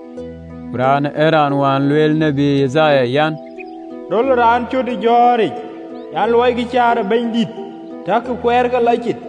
(LXX). Ku raanë ee raan wään lueel tiët Yithaya an: “Röl ë raan cöt ë jɔ̈ɔ̈ric, an, ‘Luɔikï kueer ë Bɛ̈nydït, Takï kuɛɛrke lɔ cit!’”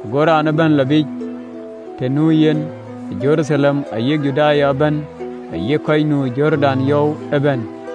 Go raan ëbɛ̈n lɔ biic të nu yen, Jeruthalem ayï Judaya ëbɛ̈n, ayï kɔc nu ë Jordan yɔu ëbɛ̈n,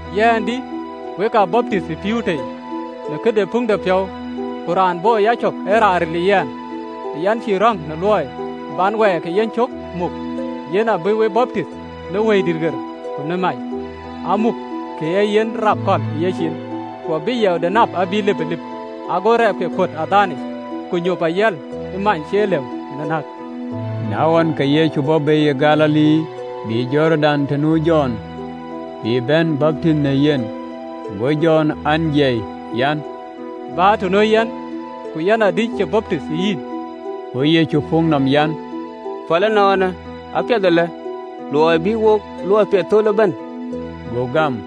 Yɛn dï, wek a baptith ë pïïu tei në këde puŋëpiɔ̈u, ku raan bɔ̈ ë yacök ee raan ril ë yɛn, yɛn cïï röŋ luɔi bän wɛɛr ke yencök muk, yen abï we baptith në Wëidït ɣer ku në mac, amuk kën ee yen rap kɔ̈l ë yeciin, ku abï yiɛɛude nap abï lipëlip, ago agamɔde kuöt ë adhaanic, ku nyop ayiɛl ë many cie lëu në näk.” Na ɣɔn, ke Yecu bɔ̈ bei ë Galili, bï Jordan të nu Jɔn, bï bɛ̈n baptith në yen. Go Jɔn an, jiɛi an, “Bä të nuö yɛn, ku yɛn adï cï baptith ë yïn?” Go Yecu puk nɔm an, “Päl ënɔɔnë, apiɛth alë, luɔi bï wok luɔi de piathëpiɔ̈u thöl ëbɛ̈n.” Go gam.